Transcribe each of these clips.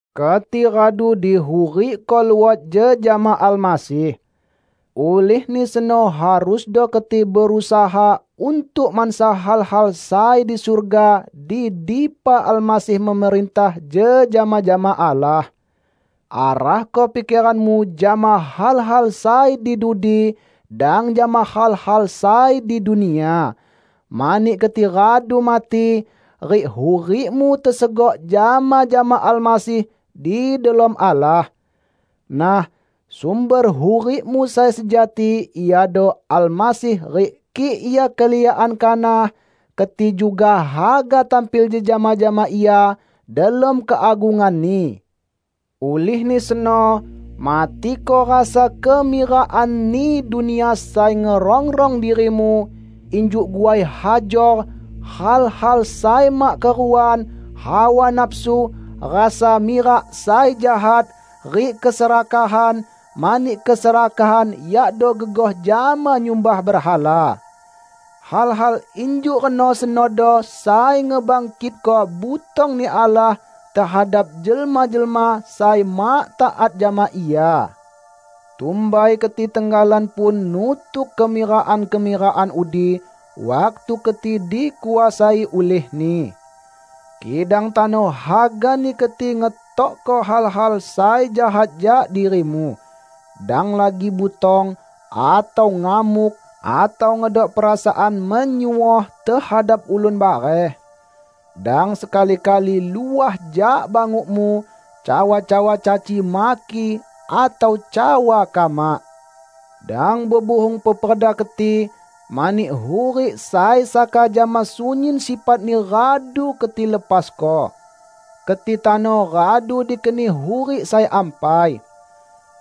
Keti radu dihurikko luot jejama Almasih. Ulihni seno harusdo keti berusaha untuk mansa hal-hal sai di surga, di dipa Almasih memerintah jejama jama Allah. Arahko pikeranmu jama hal-hal sai di dudi, dang jama hal-hal sai di dunia. Mani keti radu mati, rik hurikmu tesegok jama-jama Almasih di delom Allah. Nah, sumber hurikmu sai sejati iado Almasih rik kik Ia keliakan kanah keti juga haga tampil jejama jama Ia delom keagungan-Ni! Ulihni seno, matiko rasa kemirakanni dunia sai ngerongrong dirimu, injuk guai hajor, hal-hal sai mak keruan, hawa nafsu, rasa mirak sai jahat, rik keserakahan (mani keserakahan yakdo gegoh jama nyumbah berhala). Hal-hal injuk reno senodo sai ngebangkitko butong-Ni Allah tehadap jelma-jelma sai mak taat jama Ia. Tumbai keti tenggalan pun nutuk kemirakan-kemirakan udi, waktu keti dikuasai ulihni. Kidang tano hagani keti ngetokko hal-hal sai jahat jak dirimu: dang lagi butong, atau ngamuk atau ngedok perasaan menyuoh tehadap ulun bareh. Dang sekali-kali luah jak bangukmu cawa-cawa caci maki atau cawa kamak. Dang bebuhung peperda keti, mani hurik sai saka jama sunyin sifatni radu keti lepasko. Keti tano radu dikeni hurik sai ampai.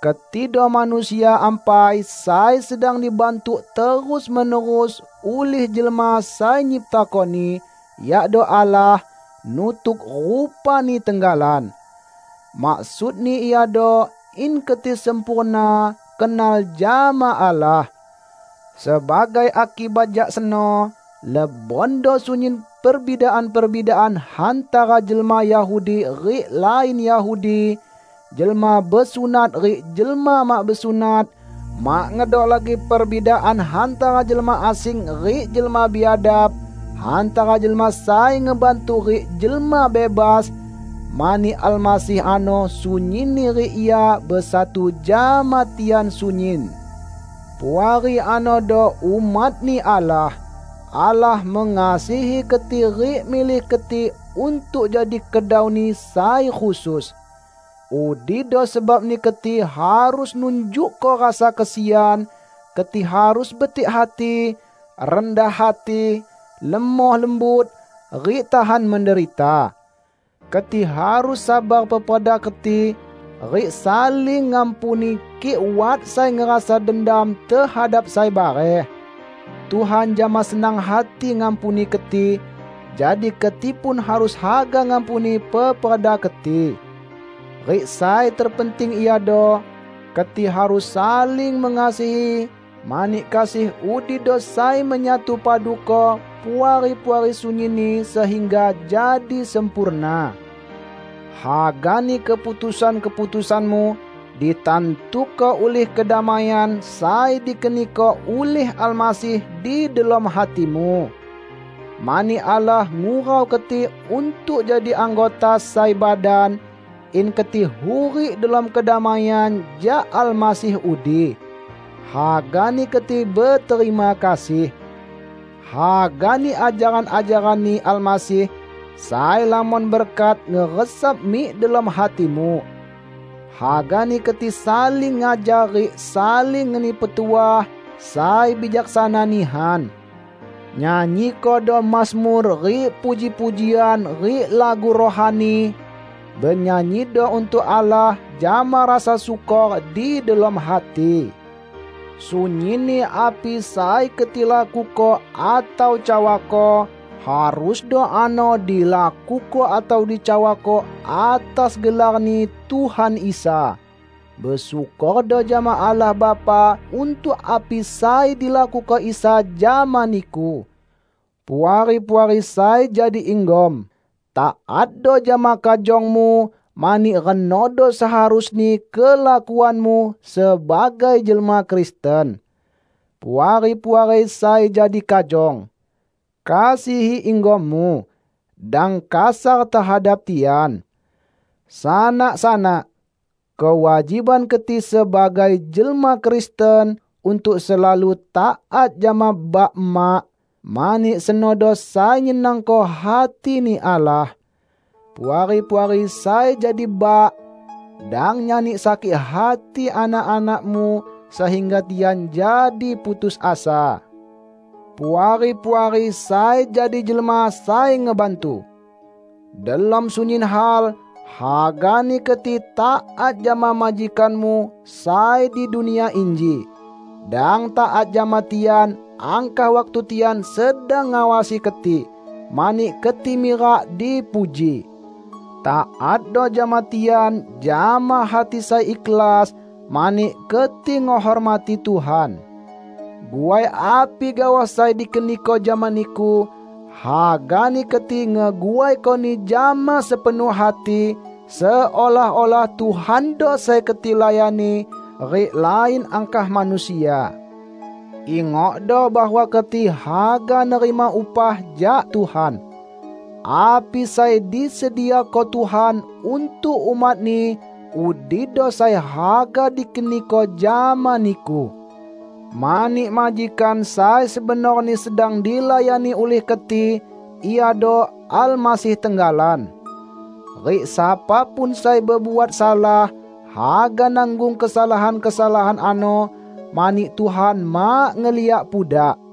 Ketido manusia ampai sai sedang dibantuk terus-menerus ulih Jelma sai nyiptakoni, yakdo Allah, nutuk rupa-Ni tenggalan. Maksudni iado in keti sempurna kenal jama Allah. Sebagai akibat jak seno, lebondo sunyin perbidaan-perbidaan hantara jelma Yahudi rik lain Yahudi, jelma besunat rik jelma mak besunat, mak ngedok lagi perbidaan hantara jelma asing rik jelma biadab, hantara jelma sai ngebantu rik jelma bebas, mani Almasih ano sunyinni rik Ia besatu jama tian sunyin! Puari anodo umat-Ni Allah. Allah mengasihi keti rik milih keti untuk jadi kedau-Ni sai khusus. Udido sebabni keti harus nunjukko rasa kesian, keti harus betik hati, rendah hati, lemoh lembut, rik tahan menderita. Keti harus sabar peperda keti, rik saling ngampuni kik wat sai ngerasa dendam tehadap sai bareh. Tuhan jama senang hati ngampuni keti, jadi keti pun harus haga ngampuni peperda keti. Rik sai terpenting iado: Keti harus saling mengasihi mani kasih udido sai menyatupaduko Puari-puari sunyinni sehingga jadi sempurna. Hagani keputusan-keputusanmu ditantuko ulih kedamaian sai dikeniko ulih Almasih di delom hatimu. Mani Allah ngurau keti untuk jadi anggota sai badan, in keti hurik delom kedamaian jak Almasih udi. Hagani keti beterima kasih. Hagani ajaran-ajaran-Ni Almasih sai lamon berkat ngeresap mik delom hatimu. Hagani keti saling ngajar rik saling ngeni petuah sai bijaksana nihan. Nyanyikodo mazmur rik puji-pujian rik lagu rohani; benyanyido untuk Allah jama rasa syukor di delom hati. Sunyinni api sai keti lakuko atau cawako, harusdo ano dilakuko atau cawako atas gelar-Ni Tuhan Isa. Besyukordo jama Allah Bapa untuk api sai dilakuko Isa jama niku. Puari-puari sai jadi inggom! Taatdo jama kajongmu, mani renodo seharusni kelakuanmu sebagai jelma Kristen. Puari-puari sai jadi kajong! Kasihi inggommu. Dang kasar tehadap tian. Sanak-sanak! Kewajiban keti sebagai jelma Kristen untuk selalu taat jama bak-emak, mani senodo sai nyenangko hati-Ni Allah. Puari-puari sai jadi bak! Dang nyani sakik hati anak-anakmu sehingga tian jadi putus asa. Puari-puari sai jadi jelma sai ngebantu! Delom sunyin hal, hagani keti taat jama majikanmu sai di dunia inji. Dang taat jama tian angkah waktu tian sedang ngawasi keti, mani keti mirak dipuji. Taatdo jama tian jama hati sai ikhlas, mani keti ngehormati Tuhan. Guai api gaoh sai dikeniko jama niku, hagani keti ngeguaikoni jama sepenuh hati, seolah-olah Tuhando sai keti layani, rik lain angkah manusia. Ingokdo bahwa keti haga nerima upah jak Tuhan. Api sai disediako Tuhan untuk umat-Ni, udido sai haga dikeniko jama niku. Mani majikan sai sebenorni sedang dilayani ulih keti iado Almasih tenggalan. Rik sapa pun sai bebuat salah, haga nanggung kesalahan-kesalahan ano; mani Tuhan mak ngeliak pudak.